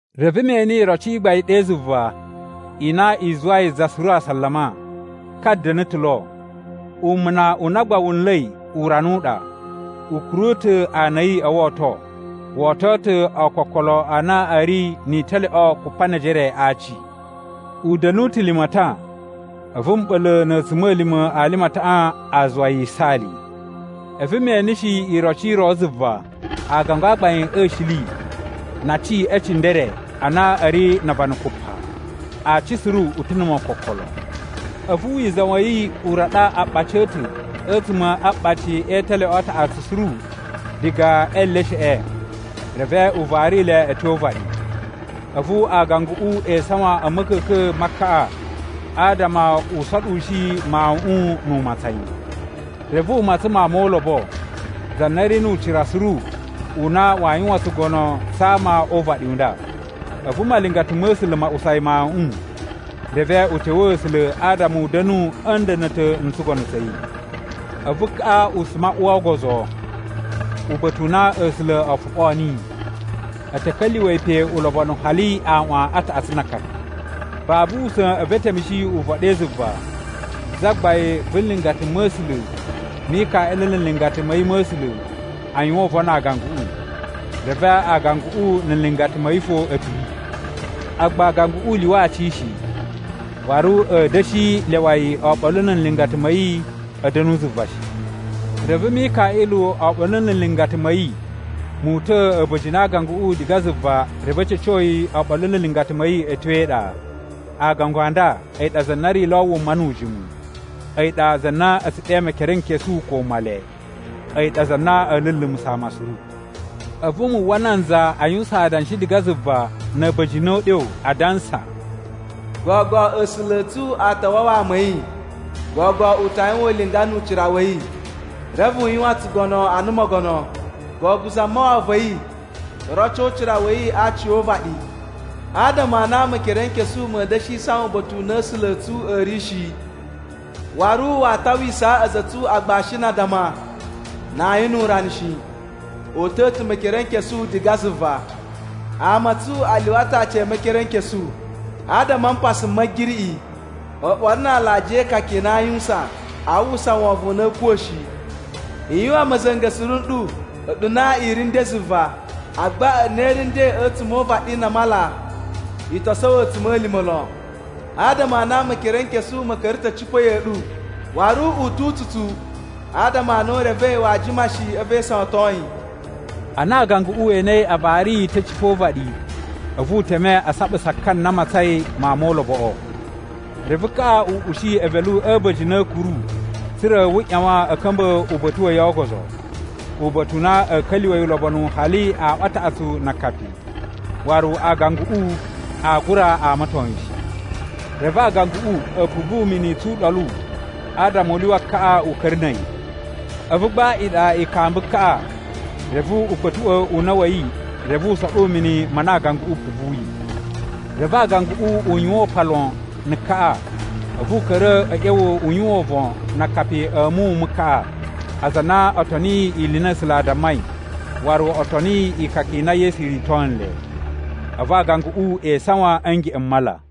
Reve me ene iroci i gbain ɗe zuva i na i zuwai za suru asalama. Ka da̱na̱ ta̱ lo, umuna u na gba wu nla̱i urana u ɗa. U kuru ta̱ ana a̱ yi o woto. Wo oto ta̱ ookokolo a na a̱ ri ni italyoꞌo kupa ne ejere a aaci. U da̱nu ta̱ limatan, a̱vu mɓa̱la̱ na̱ a̱tsuma̱lima̱ a limataꞌan a zuwa yi yisaali. A̱vu me eneshi iroci i ro zuva, aagangu a gbain a̱ shili na aci e cindere a na a̱ ri na avana kupa. Aaci suru u ta̱ na̱ mokokolo. A̱vu wizan wa̱ yi u raɗa aaɓaci a̱ ta̱ a̱tsuma̱ a aɓaci e italyoꞌo a taꞌatsu suru diga e elesheꞌe, reve u vari le a̱ tyo o uvaɗi. A̱vu aaganguꞌu e isawan a̱ ma̱ka̱ka̱n ma kaꞌa adama u soɗushi mawuꞌun nu u matsan yi. Reve u matsan mawun mo ulobo, za na ri nu ucira suru u na waa yuwan tsugono tsa ama o uvaɗi u nda. A̱vu malingata ma̱ A̱sula̱ ma usa yi mawuꞌun reve u tewee A̱sula̱ adama u da̱nu a̱ nda̱na̱ta̱ n tsugono tsa̱ yi. A̱vu kaꞌa u suma u uwa o ogozo, uba̱ta̱ u na A̱sula̱ o foɓoo niyi. A̱ ta̱ ka̱lyuwa̱ yi pe ulobonu hali aꞌwan a taꞌatsu na akapi. Babu usa̱n a̱vu e temushi uvon ɗe zuva: zagbain vu nlingata ma̱ A̱sula̱ Mikaꞌilu na̱ nlingata ma̱ yi ma̱ A̱sula̱ a yuwan uvon na aaganguꞌu, reve aaganguꞌu na̱ nlingata ma̱ yi fo a̱ piri. Agba aaganguꞌu u lyuwa aci shi, waru a̱a̱ da̱shi lyawa yi oɓolo na̱ nlingata ma̱ yi a̱ da̱nu zuva shi. Reve Mikaꞌilu oɓolo na̱ nlingata ma̱ yi mu uta̱a̱ a̱ba̱jini a aaganguꞌu diga zuva reve a̱ ca̱co yi oɓolo na̱ nlingata ma̱ yi a̱ tyo e iɗa. Aagangu a nda a̱yi ɗa za na ri lo wuma nu ujimu. A̱yi ɗa za na a̱ tsu ɗe Mekerenkesu ko Male. A̱yi ɗa za na a̱a̱ lulumusa̱ ama suru. A̱vu mu uwwa nanza a yuwusan adanshi diga zuva na̱ a̱ba̱jini o uɗyo adansa: “Gogo A̱sula̱ a̱ tsu a ta wawa ama a̱ yi! Gogo u ta yuwan ulinga nu ucira wa̱ yi, reve u yuwan tsugono ana mogono! Gogo Zamawawa va̱ yi to roco ucira wa̱ yi a aci o uvaɗi! Adama a na Mekerenkesu ma̱a̱ da̱shi isawan uba̱ta̱ u na A̱sula̱ a̱ tsu a̱ ri shi, waru waa tawisaa a̱za̱ a̱ tsu agbashi na addama na ayin nu urana shi. O uta̱a̱ ta̱ Mekerenkesu diga zuva! Ama a̱ tsu a lyuwa ta̱ aci e Mekerenkesu adama a mpasa m Ma̱giriꞌi, oɓolo na alajiya e ikaka i na aa yuwusan. Aa uwwusa wovon u na a̱a̱ kuwa̱ shi. I yuwan ma̱za̱nga̱ suru nɗu a̱ɗu na i ri nden zuva. Agba a̱ɗu na i ri nden a̱tsuma̱ o uvaɗi na a mala, i to sowo a̱tsuma̱lima̱ lon. Adama a na Mekerenkesu ma̱ ka̱ra̱ ta̱ a̱ cipa̱ ya̱ꞌa̱ ɗu, waru u tu utsutsu, adama a na u revei waa jima shi a̱vu e isawaton yi.” Ana aaganguꞌu we enei a vari yi ta̱ a̱ cipa̱ o uvaɗi, a̱vu u teme a saɓusa ka na matsain mawun mo uloboꞌo. Reve kaꞌa u ushi evelu a̱ a̱ba̱jini a̱ a̱a̱kuru tsa̱ra̱ wu ꞌyawan a̱ ka̱mba̱ uba̱ta̱ wa̱ yi o ogozo. Uba̱ta̱ u na a̱a̱ ka̱lyuwa̱ yi ulobonu hali aꞌwan a taꞌatsu na akapi, waru aaganguꞌu aa gura amaton yi shi. Reve aaganguꞌu a̱ puvu mini tsu uɗolu adama u lyuwa kaꞌa u ka̱ra̱ na̱ a̱yi. A̱vu gba iɗa i kamba kaꞌa, reve u kpa̱tuꞌwa̱ una̱ wa̱ yi reve u soɗu mini ma na aaganguꞌu u puvuyi. Reve aaganguꞌu u yuwan upan lon na̱ kaꞌa, a̱vu u ka̱ra̱ a̱ ꞌya̱wa̱ u yuwan uvon na akapi a̱ muwun mu kaꞌa, aza a na o toniyi ili i na A̱sula̱ a dammai, waru o toniyi ikaka i na Yesu rito nle. A̱vu aaganguꞌu e isawan a̱ ngeꞌen m mala.